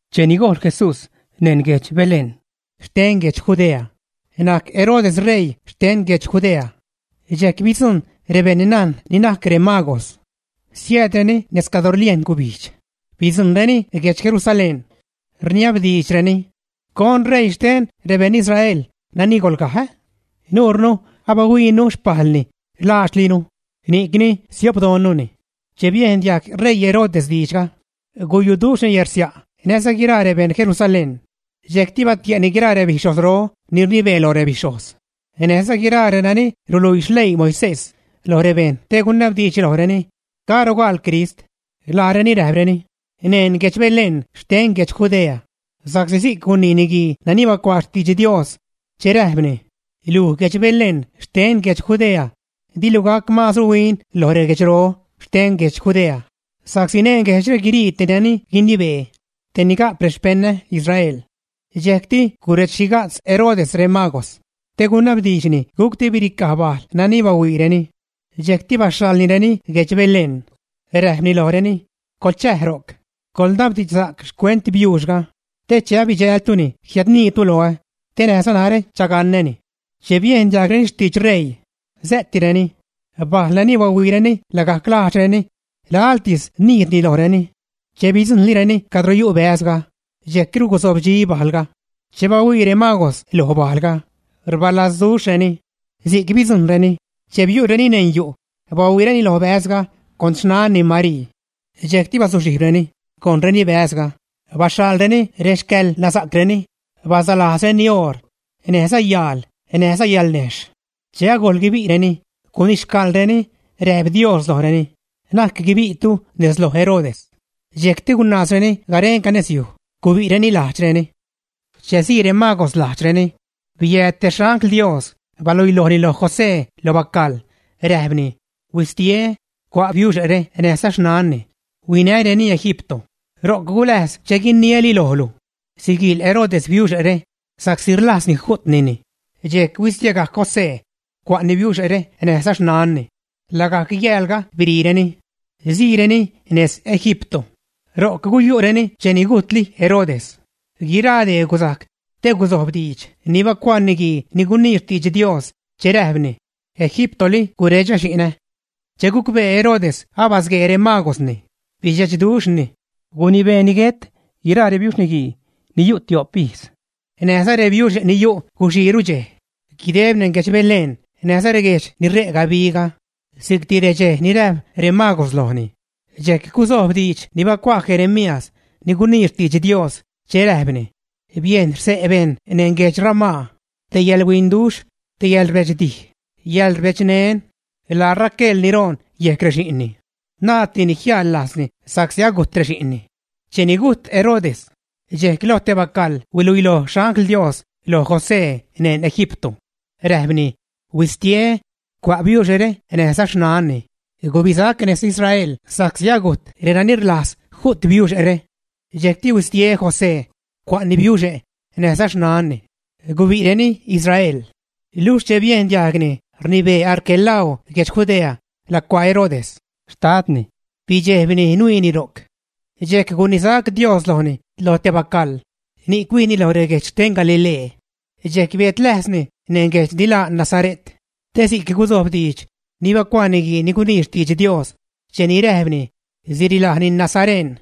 Cheni gojl Jesús neṉ guedx Belén xten guedx Judea, najc Herodes ṟeii xten guedx Judea. Dxejc bidzujṉ rebeṉnajn ni najc remagos, siäädreni nejz cadro rliejn gubijdx, bidzujṉreni guedx Jerusalén. Rniabdiidxreni: ―¿Con ṟeii xten rebeṉ Israel nani golgaj, ä? Nurnu abihuiinu xpajlni laadxlinu, ni'cni siopdoṉnuni. Che biejn diajg ṟeii Herodes diidxga, guyuduxhni yärsia' näjza guiraa rebeṉ Jerusalén. Dxejcti batie'ni guiraa rebixhojzro ni rnibee loj rebixhojz, näjza guiraa renani ruluii xleii Moisés lo rebejṉ te gunabdiidxni lojreni: ―¿Caro gaal Crist? Laareni räjpreni: ―Neṉ guedx Belén xten guedx Judea sa'csi si'c gunii niguii ni bacuaa xtidx Dios che räjpni: Luj guedx Belén xten guedx Judea, dilu gajc maazru huin loj reguedxro xten guedx Judea sa'csi neṉ guejdxre guirii tej nani guinibee, te ni ga'p rexpeṉä Israel. Dxejcti guredx-xhiga'tz Herodes remagos te gunabdiidxni gucti biricaj bajl nani bahuiireni. Dxejcti baxhaḻnireni guedx Belén, räjpni lojreni: ―Coḻchäj ro'c, coḻnabdiidxsa'c xcuent biuuxga te che abidxältuni jiädniitu loä te näjza narä chagaṉäni. Che biejn diajgreni xtidx ṟeii, sä'tireni. Bajl nani bahuiireni lagajc lajdxreni laḻtis nijdni lojreni. Che bidzujṉlireni cadro yu' bäzga, dxejcru guzobdxi bajlga. Che bahuii remagos loj bajlga, rbalazduxhreni. Si'c bidzujṉreni. Che biu'reni neṉ yu', bahuiireni lo bäzga con xnanni Marii. Dxejcti bazuxhijbreni, gojṉreni bäzga, baxhalreni rexcäḻnasa'creni bazalajzreni oor, näjza yaal näjza yalnejxh. Che agojl guibi'reni, gunixcäḻreni, räjp Dios lojreni: ―Na'c guibi'tu nez loj Herodes. Dxejcti gunaazreni garenca nez yuj, gubi'reni lajdxreni. Che sii remagos lajdxreni, biääd te xangl Dios baluilojni lo José lo bacaḻ, räjpni: ―Huistie, cua' biuxe're näjza xnanni, huinäreni Egipto. Ro'c guläjz che guiniäli lojlu. Siguiil Herodes biuxe're sa'csi rlajzni ju'tnini. Dxejc huistiegajc José, cua'ni biuxe're näjza xnanni, lagajc yäälga biriireni, siireni nez Egipto. Ro'c guyu'reni cheni gujtli Herodes. Guiraa dee guzajc te guzojb diidx ni bacuaa niguii ni gunii xtidx Dios che räjpni: “Egiptoli guredxä xi'nä.” Che gucbee Herodes abasguee remagosni, bidxechduxhni. Gunibeeni guet guiraa rebiuxniguii ni yu' tio'p ijz näjza rebiuxe' ni yu' guxiiru dxej, guideb neṉ guedx Belén näjza reguejdx ni re' gabiga, si'cti redxej ni räjp remagos lojni. Dxejc guzojb diidx ni bacuaa Jeremías ni gunii xtidx Dios che räjpni: Biejn xse' bejṉ neṉ guedx Ramá, te yäḻhuinduxh, te yäḻrbedxdij, yäḻrbedxneṉ: laa Raquel ni roon yejc rexi'nni. Naaddini jiäjḻ lajzni sa'csi agujt rexi'nni. Cheni gujt Herodes, dxejc lo te bacaḻ huiluiloj xangl Dios loj José neṉ Egipto. Räjpni: ―Huistie, cua' biuxe're näjza xnanni, gubisac nez Israel sa'csi agujt renani rlajz ju't biuxe're. Dxejcti huistie José, cua'ni biuxe' näjza xnanni. Gubi'reni Israel. Luxh che biejn diajgni rnibee Arquelao guejdx Judea lacuaa Herodes, xtadni, bidxejbni nuiini ro'c. Dxejc gunisac Dios lojni loj te bacaḻ, ni'c huijni lo reguejdx xten Galilee. Dxejc biädläjzni neṉ guejdx ni laa Nazare't te si'c guzojb diidx ni bacuaa niguii ni gunii xtidx Dios cheni räjpni: “Sirilajni nazareṉ.”